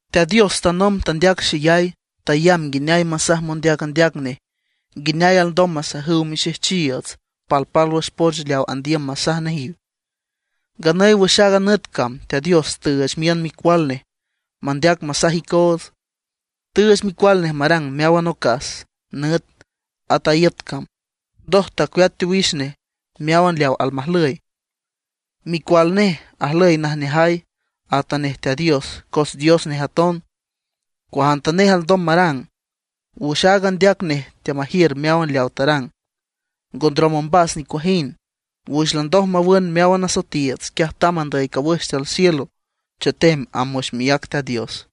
Teat Dios tanomb tandeac xeyay, tayamb nguineay masaj mondeac andeac nej (profetas) nguineay alndom masajüw mixejchiiüts palpálwüx poch leaw andiüm masaj nejiw. Nganüy wüx aaga nüt cam Teat Dios tüüch miün Micual Nej mandeac masaj icoots. Tüüch Micual Nej marang meáwan ocas, nüt, at a iüt cam; ndoj tacueat teowix nej meáwan leaw almajlüy. Micual nej ajlüy najneajay, atanej Teat Dios cos Dios nej aton; cuajantanej alndom marang. Wüx áagan andeac nej teamajiür meáwan leaw tarang, ngo ndrom ombas nicuajind. Wüx landoj mawün meáwan asoetiiüts, quiaj tamb andüy cawüx tiül cielo chetem amb wüx miác Teat Dios.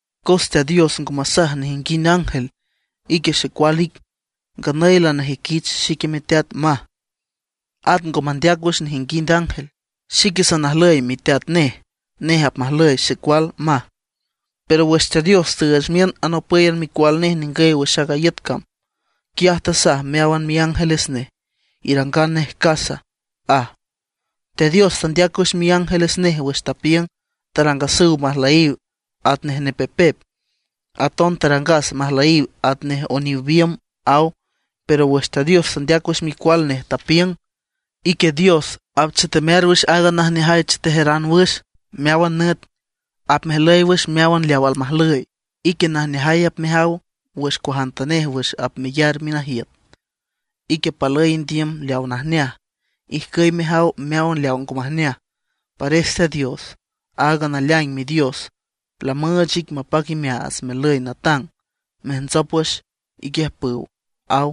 Cos Teat Dios ngo masaj nejinguind ángel: Ique Xecual ic; nganüy lanajüiquich xique miteat, aj. At ngo mandeac wüx nejinguind ángel: Xique sanajlüy miteat nej, nej apmajlüy xecual, aj. Pero wüx Teat Dios tüüch miün anopǘyan Micual nej ningüy wüx a iüt cam, quiaj tasaj meáwan miángeles nej: Irangan nej casa, aj. Teat Dios tandeac wüx miángeles nej wüx tapiüng: Tarangasüw majlüyiw atnej nepepep, aton tarangas majlüyiw atnej oniw biümb, aw. Pero wüx Teat Dios tandeac wüx Micual Nej, tapiüng: Ique Dios, apchetemear wüx aaga najneajay chetejeran wüx meáwan nüt; apmejlüy wüx meáwan leaw almajlüy. Ique najneajay apmejaw wüx cuajantanej wüx apmeyar minajiüt. Ique palüy indiüm leawa najneaj, ijcüy mejaw meáwan leawa ngo majneaj; pares Teat Dios, aaga naleaing Midios, lamüüch ic mapac imeaats mejlüy natang, mejntsop wüx iquiüjpüw, aw.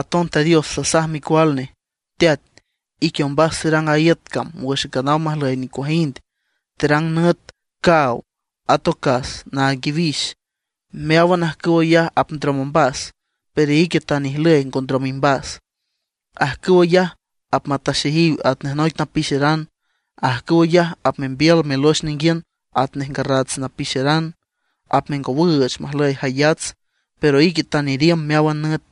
Aton Teat Dios tasaj Micual Nej: Teat, ique ombas terang a iüt cam wüx nganaw majlüy nicuajind, Terang nüt, caaw, at ocas naag iwix. Meáwan ajcüw ayaj apndrom ombas, pero ique tan ijlüy ngo ndrom imbas. Ajcüw ayaj apmataxeyiw atnej noic napixeran; ajcüw ayaj apmembiül melox ninguiün atnej ngarrats napixeran, apmengowüüch majlüy jayats. Pero ique tan iriümb meáwan nüt,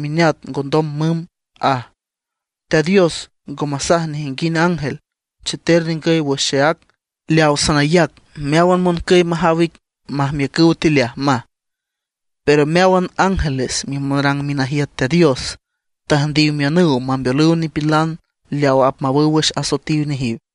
mineat ngondom mümb, aj. Teat Dios ngo masaj nejinguind ángele: Cheter ningüy wüx xeác, leaw sanayac meáwan moncüy majaw ic majmiücüw tileaj, maj. Pero meáwan ángeles mimonrang minajiüt Teat Dios, tüjndiw miünüw mambeolüw nipilan leaw apmawüw wüx asoetiw nejiw.